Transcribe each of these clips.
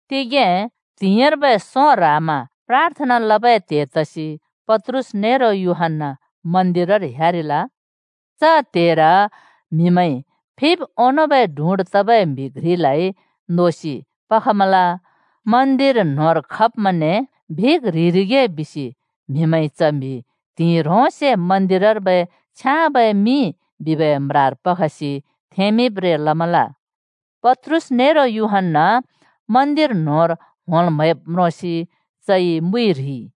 तिगें त्हिंइर्बै सों ह्रामा प्राथना लबै त्हे तसि पत्रुस नेरो यूहन्‍ना मन्दिरर ह्‍यारिल। च त्हेर म्हिमैंइ फिब् ओंनोंबै डुँड् तबै म्हि घ्रिलाइ नोसि पखमल। मन्दिर न्होंर खब्मैंने भिक् ह्रिरिगे बिसि म्हिमैंइ च म्हि त्हिंइ ह्रोंसे मन्दिरर्बै “छ्याँबै मिं” बिबै म्रार पखसि थेंमिंब्रें लमल। पत्रुस नेरो यूहन्‍ना मन्दिर न्होंर होंल् म्हैब् म्रोंसि चइ मुइ ह्रिइ।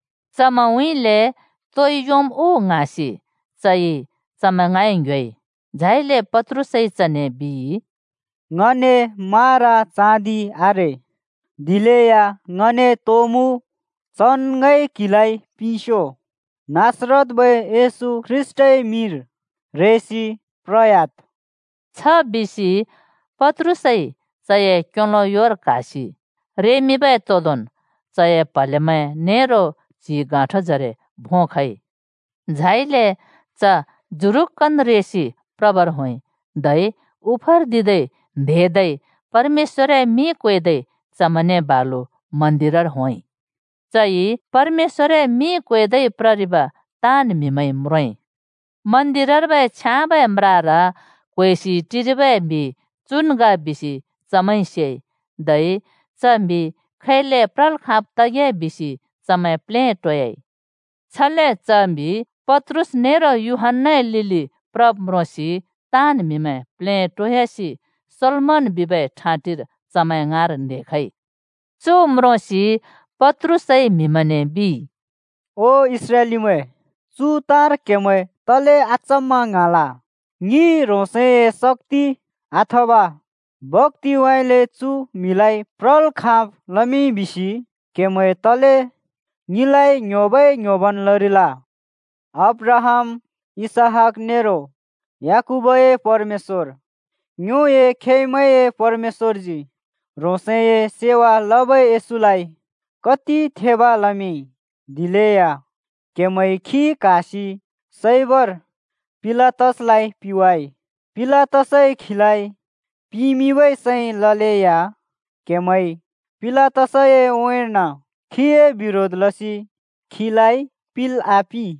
चमैंउँइँले तोइ योंम् उ ङ्हाँसि चइ चमैं ङाँइ ङ्‍ह्‍योइ। झाइले पत्रुसइ चने बिइ, “ङने मारा चाँदि आरे, दिलेया ङने तो मुँ चन् ङइ क्हिलाइ पिंस्यो। नासरतर्बै येशू ख्रीष्‍टए मिंर रेसि प्रह्‍याद्।” छ बिसि पत्रुसइ चए क्योलो योर क्हासि रेमिंबै तोंदोंन् चए प्हलेमैं नेरो च्हि गाँठोजरे भों खइ। झाइले च जुरुक्‍कन् रेसि प्रबर होंइ, धै उफर्दिदै न्हेदै परमेश्‍वरए मिं क्वेदै चमैंने बालु मन्दिरर होंइ। चइ परमेश्‍वरए मिं क्वेदै प्ररिब ताँन् म्हिमैंइ म्रोंइ। मन्दिरर्बै छ्याँबै म्रार क्होएसि टिरिबै म्हि चुन् ग बिसि चमैंइ सेइ। धै च म्हि खैले प्रल् खाँब् तगे बिसि चमैं प्लेटोयाइ। छले च म्हिइ पत्रुस नेरो यूहन्‍ना क्हाब् म्रोंसि ताँन् म्हिमैं प्लेटोयासि सोलोमन बिबै ठाँटिर चमैं ङाँर न्हेखइ। चु म्रोंसि पत्रुसइ म्हिमैंने बिइ, “ओ इस्राएलीमैं, चु ताँर क्हेमैं तले अचम्‍मा ङ्हाँल? ङिइ ह्रोंसए शक्‍ति अथवा भक्‍तिउँइँले चु म्हिलाइ प्रल् खाँब् लमिंइ बिसि क्हेमैं तले ङिलाइ ङ्ह्‍योबै ङ्‍ह्‍योबन् लरिल? अब्राहाम, इसहाक नेरो याकूबए परमेश्‍वर, ङ्योए खेमैंए परमेश्‍वरजी ह्रोंसए सेवा लबै येशूलाइ कति थेब लमिंइ। दिलेया क्हेमैंइ खी क्हासि सैबर पिलातसलाइ पिंवाइ। पिलातसइ खीलाइ पिमिंबै सैं ललेया क्हेमैंइ पिलातसए उँइँर्न खीए बिरोध लसि खीलाइ पिल् आपिं।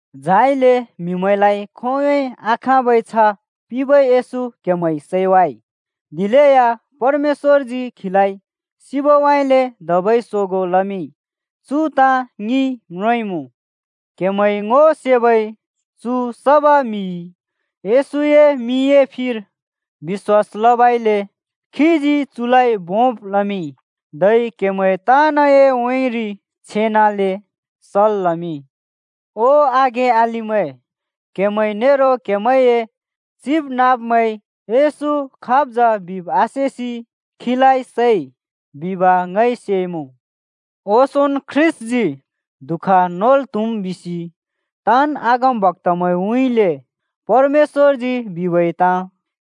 झाइले म्‍हिमैंलाइ खोंयोंन् बिलै आखाँबै छ्ह पिंबै येशू क्‍हेमैंइ सैवाइ। दिलेया परमेश्‍वरजी खीलाइ सिबउँइँले धबै सोगों लमिंइ। चु ताँ ङिइ म्रोंइमुँ। क्हेमैंइ ङो सेबै चु सबै म्हिइ येशूए मिंए फिर बिश्‍वास लबइले खीजी चुलाइ भोंब् लमिंइ। धै क्हेमैं ताँनए उँइँरि छेनाले सल् लमिंइ। “ओ आघें अलिमैं, क्‍हेमैं नेरो क्‍हेमैंए चिबनाँब्मैंइ येशू खाब् जा बिब् आसेसि खीलाइ सैइ बिब ङइ सेइमुँ। ओंसोंन् ख्रीष्‍टजी दुःख नोल् त्हुम् बिसि ताँन् अगमबक्‍तामैंउँइँले परमेश्‍वरजी बिबै ताँ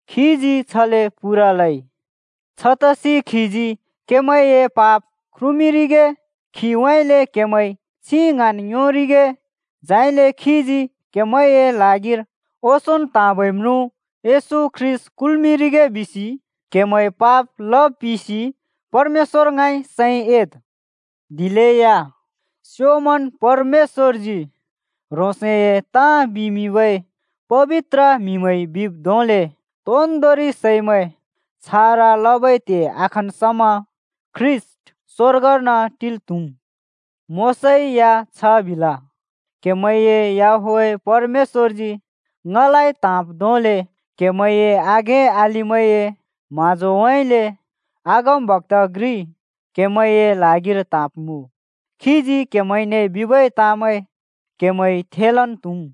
खीजी छले पूरा लइ। छतसि खीजी क्हेमैंए पाप ख्रुमिंरिगे, खीउँइँले क्हेमैं छिं ङ्हाँन् योंरिगे, झाइले खीजी क्हेमैंए ल्हागिर ओंसोंन् त्हाँबै म्रुँ ख्रीष्‍ट येशू कुल्‍मिंरिगे बिसि क्हेमैंइ पाप लब पिसि परमेश्‍वर ङाँइ सैं एद्। दिलेया स्योंमन् परमेश्‍वरजी ह्रोंसए ताँ बिमिंबै पबित्र म्‍हिमैंइ बिब् धोंले तोन्दोंरि सैमैं छारा लबै त्हे आखन् समा ख्रीष्‍ट स्वर्गर्न टिल् त्हुम्। मोशाइ या छ बिल, ‘क्हेमैंए याहवेह परमेश्‍वरजी ङलाइ त्हाँब् धोंले क्हेमैंए आघें अलिमैंए म्हाँजोउँइँले अगमबक्‍ता घ्रि क्हेमैंए ल्हागिर त्हाँब्मुँ। खीजी क्हेमैंने बिबै ताँमैं क्हेमैंइ थेलन् त्हुम्।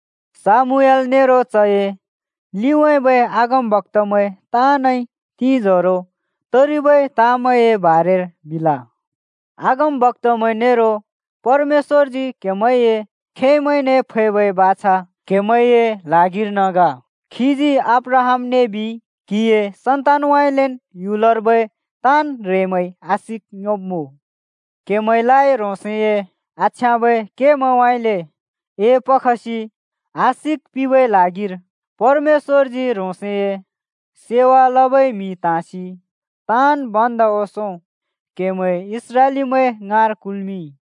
शामूएल नरो चए लिउँइँबै अगमबक्‍तामैं ताँनइ तिंजोरो तरिबै ताँमैंए बारेर बिल। अगमबक्‍तामैं नेरो परमेश्‍वरजी क्हेमैंए खेमैंने फैबै बाछा क्हेमैंए ल्हागिर्न ग। खीजी अब्राहामने बिइ, ‘क्हिए सन्तानउँइँलेन् ह्‍युलर्बै ताँन् ह्रेंमैंइ आशिक योंब्मुँ।’ क्हेमैंलाइ ह्रोंसए आछ्याँबै केमैंउँइँले एपखसि आशिक पिंबै ल्हागिर परमेश्‍वरजी ह्रोंसए सेवा लबै म्हि त्हाँसि ताँन् भन्दा ओंसों क्हेमैं इस्राएलीमैं ङाँर कुल्मिंइ।”